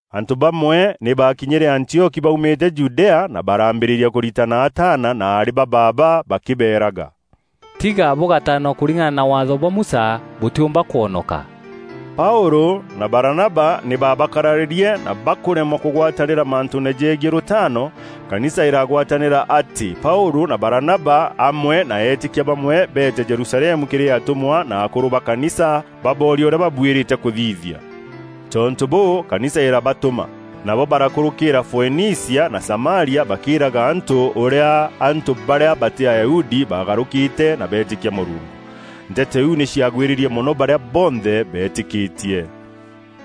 Antû bamwe nî baakinyîre Antioki baumîte Judea na baraambîrîria kûritana ataana na aarî ba baaba bakîbeerega, “Tiga bûgataanwa kûringana na Waatho bwa Musa, bûtîûmba kwonoka.” Paûlû na Baranaba nî baabakararîrie na bakûremwa kûgwatanîra mantûûne jegiî rûtaano, kanisa îragwatanîra atî Paûlû na Baranaba amwe na eetîkia bamwe beete Jerusalemu kîrî atûmwa na akûrû ba kanisa, baboorie ûrîa babuîrîte kûthithia. Tontû bûû, kanisa îrabatûma. Nabo barakûrûkîîra Foenicia na Samaria bakîîraga antû ûrîa antû barîa batî Ayahudi baagarûkîte na beetîkia Mûrungu. Nteto iu nî ciagwîrîrie mono barîa bonthe beetîkîtie.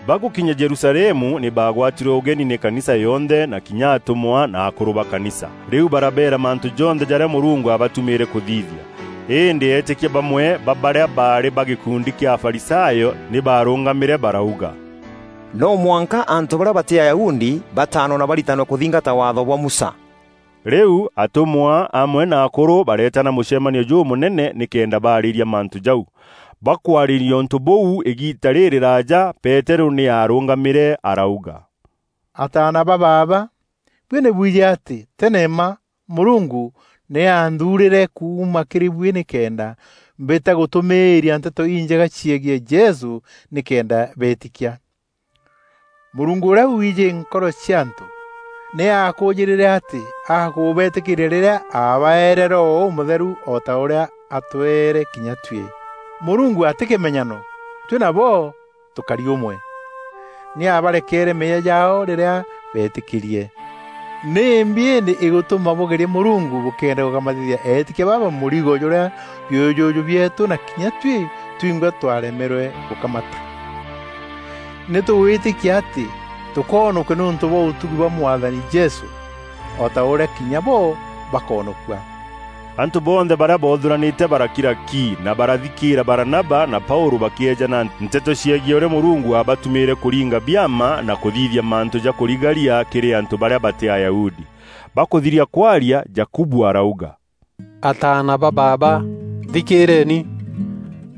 Bagûkinya Jerusalemu nî baagwatîrwe ûgeni nî kanisa yonthe na kinya atûmwa na akûrû ba kanisa. Rîu barabeera mantû jonthe jarîa Mûrungu aabatumîîre kûthithia. Îndî eetîkia bamwe ba barîa baarî ba gîkundi kîa Afarisayo nî baarûngamîre barauga, “No mwanka antû barîa batî Ayahudi bataanwe na baritanwe kûthingata Waatho bwa Musa.” Rîu atûmwa amwe na akûrû bareetana mûcemanio jûmûnene nîkenda baarîîria mantû jau. Bakwarîîria ûntû bûu îgiita rîrîraaja, Peterû nî aarûngamîre arauga, “Ataana ba baaba, buî nî bwijî atî tene mma Mûrungu nî aanthuurîre kuuma kîrî buî nîkenda mbîta gûtûmîîria Nteto Injega ciegiî Jesû nîkenda beetîkia. Mûrungu ûrîa wiijî nkoro cia antû, nî aakûûjîrîre atî akûbetîkîîria rîrîa aabaeere Roho Ûmûtheru o ta ûrîa aatweere kinya tuî. Mûrungu atî kîmenyano; tuî nabo tûkari ûmwe. Nî aabarekeere meeyia jaao rîrîa beetîkîrie. Nîmbi îndî îgûtûma bûgeria Mûrungu bûkîenda gûkamatithia eetîkia baba mûrigo jûrîa biûjûjû bieetû na kinya tuî twingwa twaremerwe gûkamata? Nî tûgwîtîkia atî tûkoonokua nîûntû bwa ûtugi bwa Mwathani Jesû, o ta ûrîa kinya bo bakoonokua.” Antû bonthe barîa boothûranîte barakira ki, na barathikîîra Baranaba na Paûlû bakîeejana nteto ciegiî ûrîa Mûrungu aabatumîîre kûringa biama na kûthithia mantû ja kûrigaria kîrî antû barîa batî Ayahudi. Bakûthiria kwaria, Jakubu arauga, “Ataana ba baaba, nthikîîreeni!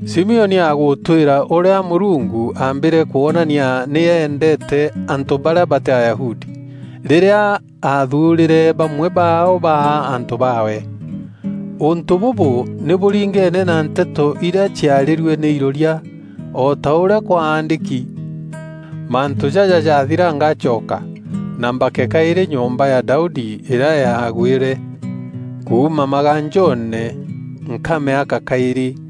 Simioni agûtwîra ûrîa Mûrungu aambîre kwonania nî eendeete antû barîa batî Ayahudi, rîrîa aathuurîre bamwe baao baa antû baawe. Ûntû bûbû nî bûringeene na nteto irîa ciarîrue nî iroria, o ta ûrîa kwaandîki: ‘Mantû jaja jaathira ngacoka, na mbake kaîrî nyomba ya Daudi îrîa yaagwîre. Kuuma maganjoone nkamîaka kaîrî,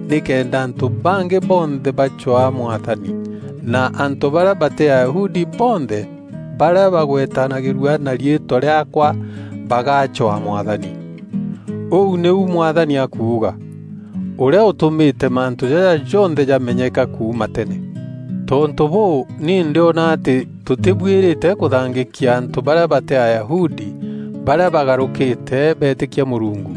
nîkenda antû bangî bonthe bacwaa Mwathani, na antû barîa batî Ayahudi bonthe barîa bagwetanagîrua na riîtwa rîaakwa bagacwaa Mwathani. Ûu nîu Mwathani akuuga, ûrîa ûtûmîte mantû jaja jonthe jamenyeka kuuma tene.’ “Tontû bûû, ni ndîona atî tûtîbuîrîte kûthangîkia antû barîa batî Ayahudi, barîa bagarûkîte beetîkia Mûrungu.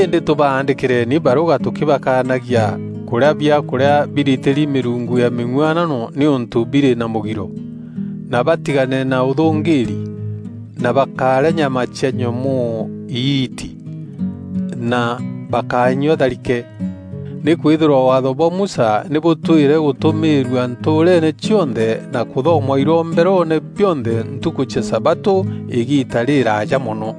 Îndî, tûbaandîkîreni barûga tûkîbakanagia: kûrîa biakûrîa biritîri mîrungu ya mîng'uanano nîûntû birî na mûgiro; na batigane na ûthûngîîri; na bakárîa nyama cia nyomoo îiiti; na bakányua tharike. Nîkwîthîrwa Waatho bwa Musa nî bûtwîre gûtûmîîrua ntûûreene cionthe na kûthomwa iromberoone bionthe ntukû cia sabatû îgiita rîrîraaja mono.”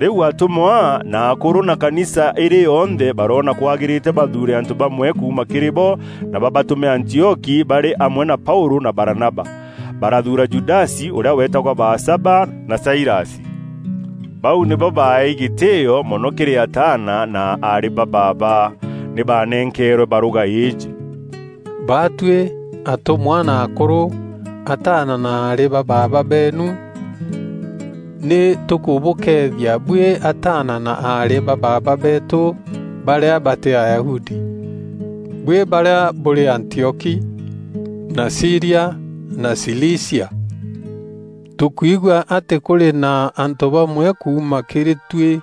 Rîu atûmwa, na akûrû na kanisa îrî yonthe baroona kwagîrîte bathuure antû bamwe kuuma kîrî bo na babatûme Antioki barî amwe na Paûlû na Baranaba. Barathuura Judasi ûrîa weetagwa Baasaba, na Sailasi. Bau nîbo baaeei gîtîîo mono kîrî ataana na aarî ba baaba. Nî baanenkeerwe barûga îîjî: “Baatuî, atûmwa na akûrû, ataana na aarî ba baaba beenu, nî tûkûbûkeethia buî ataana na aarî ba baaba beetû barîa batî Ayahudi, buî barîa bûrî Antioki, na Sîria na Cilicia. Tûkwigua atî kûrî na antû bamwe kuuma kîrî tuî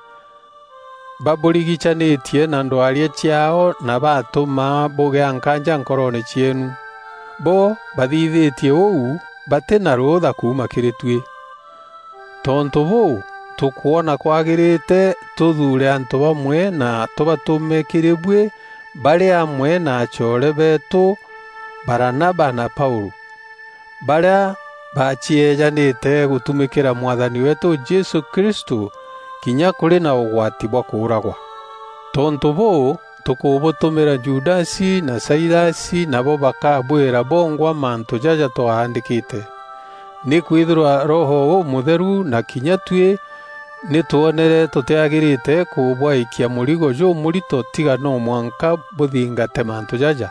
babûrigicanîtie na ndwaria ciaao na batûma bûgîa nkaanja nkoroone cieenu. Bo bathithîtie ûu batî na rûûtha kuuma kîrî tuî. Tontû bûû, tûkwona kwagîrîte tûthuure antû bamwe na tûbatûme kîrî buî barî amwe na acoore beetû Baranaba na Paûlû, barîa baacieejanîte gûtumîkîra Mwathani weetû Jesû Kristû kinya kûrî na ûgwati bwa kûûragwa. Tontû bûû, tûkûbûtûmîra Judasi na Sailasi nabo bakaabwîra bongwa mantû jaja twaandîkîte. Nîkwîthîrwa Roho Ûmûtheru na kinya tuî nî twonere tûtîagîrîte kûbwaîkia mûrigo jûmûrito tiga no mwanka bûthingate mantû jaja: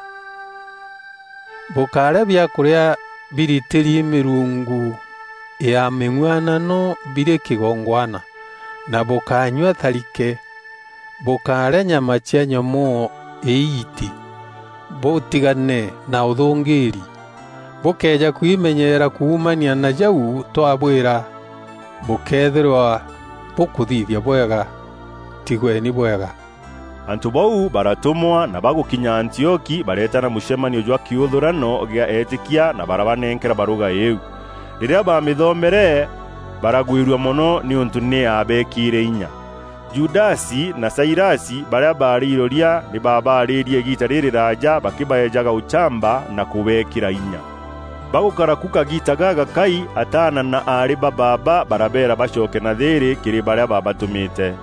Bûkárîa biakûrîa biritîri mîrungu ya mîng'uanano birî kîgongwana—na bûkányua tharike; bûkárîa nyama cia nyomoo îiiti; bûtigane na ûthûngîîri. Bûkëeja kwimenyeera kuumania na jau twabwîra, bûkeethîrwa bûkûthithia bwega. Tigweni bwega?” Antû bau baratûmwa na bagûkinya Antioki bareetana mûcemanio jwa kîûthûrano gîa eetîkia na barabanenkera barûga îîu. Rîrîa baamîthomere, baragwîrua mono nîûntû nî yaabeekîre inya. Judasi na Sailasi, barîa baarî iroria, nî baabaarîîrie îgiita rîrîraaja bakîbaejaga ûchamba na kûbeekîra inya. Bagûkara ku kagiita gagakai, ataana na aarî ba baaba barabeera bacoke na thîîrî kîrî barîa baabatûmîte. [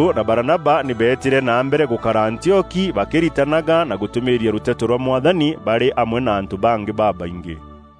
Paûlû na Baranaba nî beetîre na mbere gûkara Antioki bakîritanaga na gûtûmîîria rûteto rwa Mwathani barî amwe na antû bangî babaingî.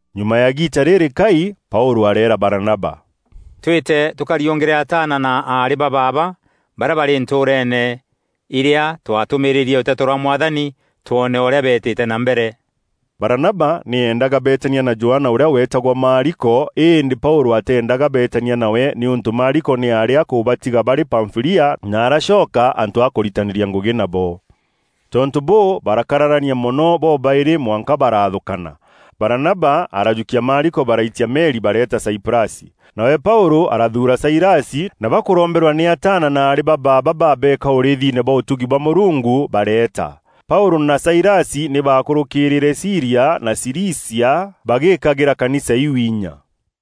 Nyuma ya îgiita rîrîkai, Paûlû areera Baranaba, “Twîte tûkariûngîre ataana na aarî ba baaba barîa barî ntûûreene irîa twatûmîrîîrie rûteto rwa Mwathani twoone ûrîa beetîte na mbere.” Baranaba nî eendaga beetania na Johana ûrîa weetagwa Maariko, îndî Paûlû ateendaga beetania nawe nîûntû Maariko nî aarî akûbatiga barî Pamfîlia na aracoka antû a kûritanîria ngûgî nabo. Tontû bûû, barakararania mono bobaîrî mwanka baraathûkana. Baranaba arajûkia Maariko, baraitia meri bareeta Saiprasi. Nawe Paûlû arathuura Sailasi, na bakûromberwa nî ataana na aarî ba baaba babeeka ûrîîthine bwa ûtugi bwa Mûrungu, bareeta. Paûlû na Sailasi nî baakûrûkîîrîre Sîria na Cilicia bagîîkagîra kanisa iu inya.